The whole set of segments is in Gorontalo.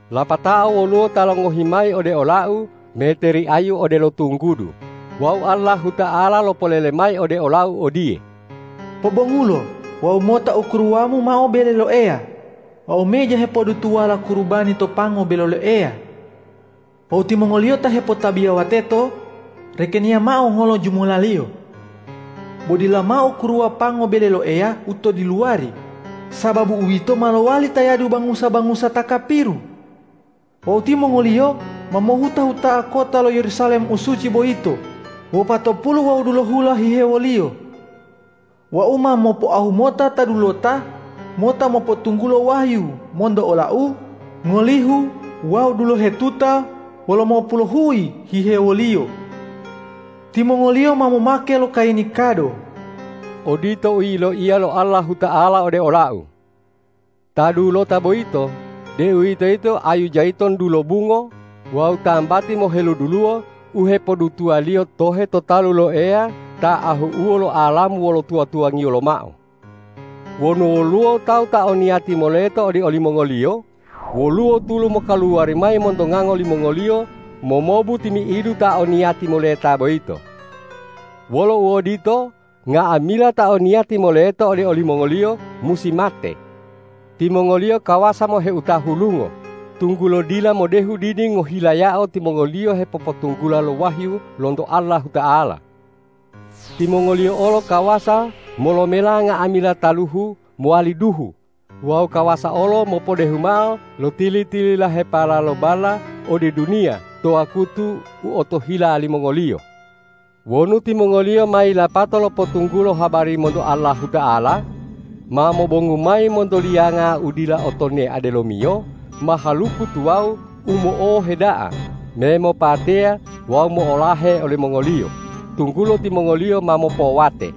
Lapatao woluwo ta longohi mayi ode olau meteri ayu odelo tunggudu wawu Allahuta'ala lopolele mayi ode olau odiye,”Pobongulo wawu mota ukuruwamu mao bele lo Eya wawu meja hepodutuwala kurubani to pango bele lo Eya. Wawu timongoliyo ta hepotabiyawa teto, rekeniya mao ngolo jumulaliyo. Bo dila mao ukuruwa pango bele lo Eya u to diluwari, sababu uwito ma lowali tayadu bangusa-bangusa ta kapiru. Wawu timongoliyo ma mohuta-huta'a kota lo Yerusalem u suci boyito wopatopulu wawu dulohula hihewoliyo. Wau ma mopoahu mota ta dulota mota mopotunggulo wahyu monto ola-U ngolihu wawu dulohetuta wolomopuluhuyi hihewoliyo. Timongoliyo ma momake lo kayini kado.” Odito u yiloiya lo Allahuta'ala ode olau. Ta dulota boyito, deuwitoyito ayu jayitun dulobungo wawu tambati moheluduluwo u hepodutuwaliyo tohe to talu lo Eya ta ahu'uwo lo alamu wolo tuwa-tuwangiyo lomao. Wonu woluwo tawu ta o niyati moleto ode olimongoliyo, woluwo tulu mokaluwari mayi monto ngango limongoliyo momobu timi'idu ta o niyati moleta boyito. Wolo uodito, nga'amila ta o niyati moleto ode olimongoliyo musi mate. Timongoliyo kawasa moheuta hulungo, tunggulo dila modehu didi ngohilayao timongoliyo hepopotunggula lo wahyu lonto Allahuta'ala. Timongoliyo olo kawasa molomela nga'amila taluhu mowali duhu wawu kawasa olo mopodehu mao lo tili-tililahepala lo balla ode duniya to wakutu u otohila limongoliyo. Wonu timongoliyo ma yilapato lopotunggulo habari monto Allahuta'ala, ma mobongu mayi monto liyanga u dila o tonea delomiyo mahaluku tuwawu u mo'ohe da'a me mopateya wawu mo'olahe olimongoliyo, tunggulo timongoliyo ma mopowate.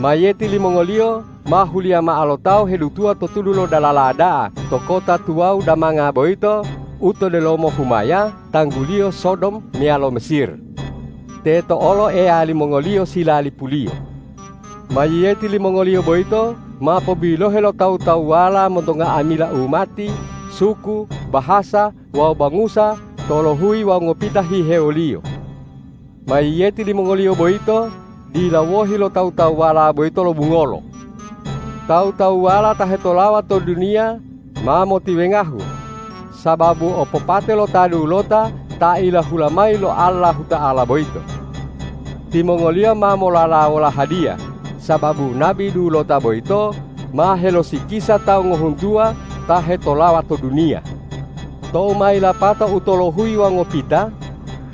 Mayiyeti limongoliyo ma huliya mao lo tawu hedutuwa to tudu lo dalala da'a to kota tuwawu damanga boyito u to delomo humaya tangguliyo Sodom meyalo Mesir. Teto olo Eya limongoliyo silalipuliyo. Mayiyeti limongoliyo boyito ma pobilohe lo tawu-tawuwala monto nga'amila umati, suku, bahasa wawu bangusa tolohuyi wawu ngopita hihewoliyo. Mayiyeti limongoliyo boyito dila wohi lo tawu-tawuwala boyito lobungolo. Tawu-tawuwala ta hetolawa to duniya ma motiwengahu, sababu opopate lo ta dulota ta ilahula mayi lo Allahuta'ala boyito. Timongoliyo ma molalawola hadiya, sababu nabi dulota boyito ma helosikisa tawu ngohuntuwa ta hetolawa to duniya. Tou ma yilapatao utolohuyi wawu ngopita,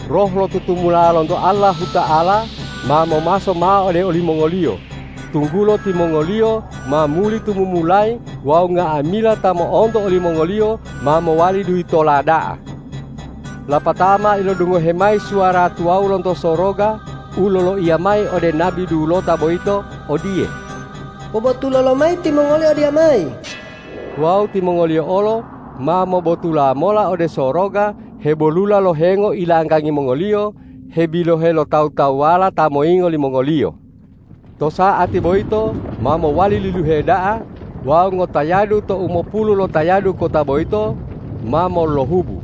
roh lo tutumula lonto Allahuta'ala ma momaso mao ode olimongoliyo, tunggulo timongoliyo ma muli tumumulayi wawu nga'amila ta mo'onto olimongoliyo ma mowali duyitola da'a. Lapatao ma ilodungohe mayi suwara tuwawu lonto soroga u loloiya mayi ode nabi dulota boyito odiye,”Pobotulo lomayi timongoli odiyamayi!” Wawu timongoliyo olo ma mobotula mola ode soroga hebolula lo hengo ilanggangi mongoliyo hebilohe lo tawu-tawuwala ta moyingo limongoliyo. To sa'atilo boyito ma mowali liluhe da'a wawu ngotayadu to umopulu lotayadu kota boyito ma molohubu.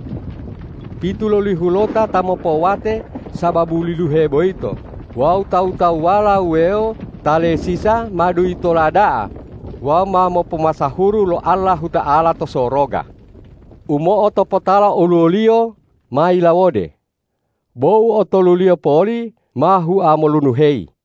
Pitulolihulota ta mopowate sababu liluhe boyito wawu tawu-tawuwala wuwewo ta lesisa ma duyitola da'a wawu ma mopomasahuru lo Allahuta'ala to soroga. U mo'otopotala oluwoliyo ma yilawode; bo u otoluliyo poli ma hua molunuheyi.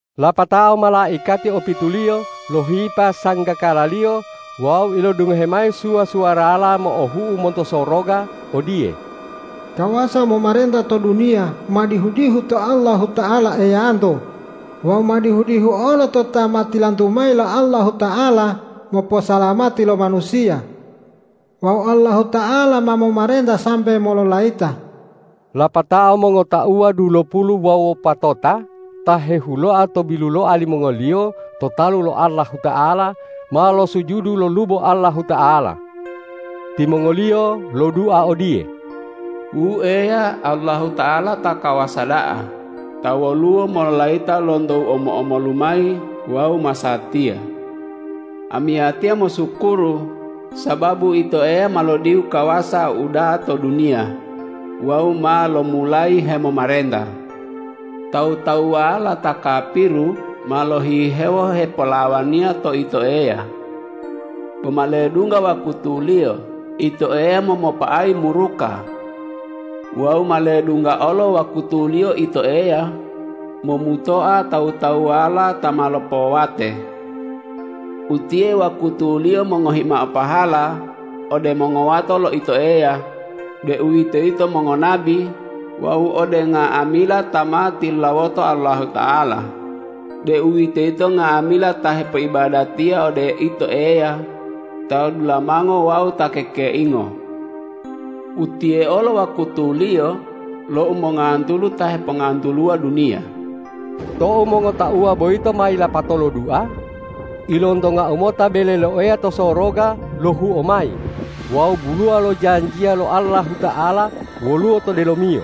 Lapatao malaikati opituliyo lohipa sanggakalaliyo wawu ilodungohe mayi suwa-suwarala mo'ohu'u monto soroga odiye,”Kawasa momarenta to duniya ma dihu-dihu to Allahuta'ala Eyanto wawu ma dihu-dihu olo to Ta ma tilantu mayi lo Allahuta'ala moposalamati lo manusiya. Wawu Allahuta'ala ma momarenta sambe mololayita.” Lapatao mongotauwa dulopulu wawu wopatota ta hehuloa to biluloa limongoliyo to talu lo Allahuta'ala, ma losujudu lolubo Allahuta'ala. Timongoliyo lodua odiye,”Wu Eya Allahuta'ala ta kawasa da'a, ta woluwo mololayita lonto u mulo-mulolo lomayi wawu masatiya! Amiyatiya mosukuru sababu Ito Eya ma lodihu kawasa uda'a to duniya wawu ma lomulayi hemomarenta! Tawu-tawuwala ta kapiru ma lohihewo hepolawaniya to Ito Eya. Bo ma ledungga wakutuliyo Ito Eya momopa'ayi muruka. Wawu ma ledungga olo wakutuliyo Ito Eya momutoa tawu-tawuwala ta ma lopowate. Utiye wakutuliyo mongohi mao pahala ode mongowato lo Ito Eya, deuwitoyito mongonabi, wawu ode nga'amila ta ma tilulawoto Allahuta'ala, deuwitoyito nga'amila ta hepoibadatiya ode Ito Eya, ta dudulamango wawu ta kekeingo. Utiye olo wakutuliyo lo umongantulu ta hepongantuluwa duniya.” Tou mongotauwa boyito ma yilapato lodua, ilontongau mota bele lo Eya to soroga lohuo mayi wawu buluwa lo janjiya lo Allahuta'ala woluwo to delomiyo.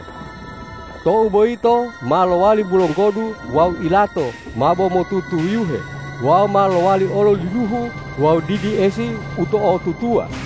Tou boyito ma lowali bulonggodu wawu ilato mabo motutuyuhe wawu ma lowali olo liluhu wawu didi esi u to'otutuwa.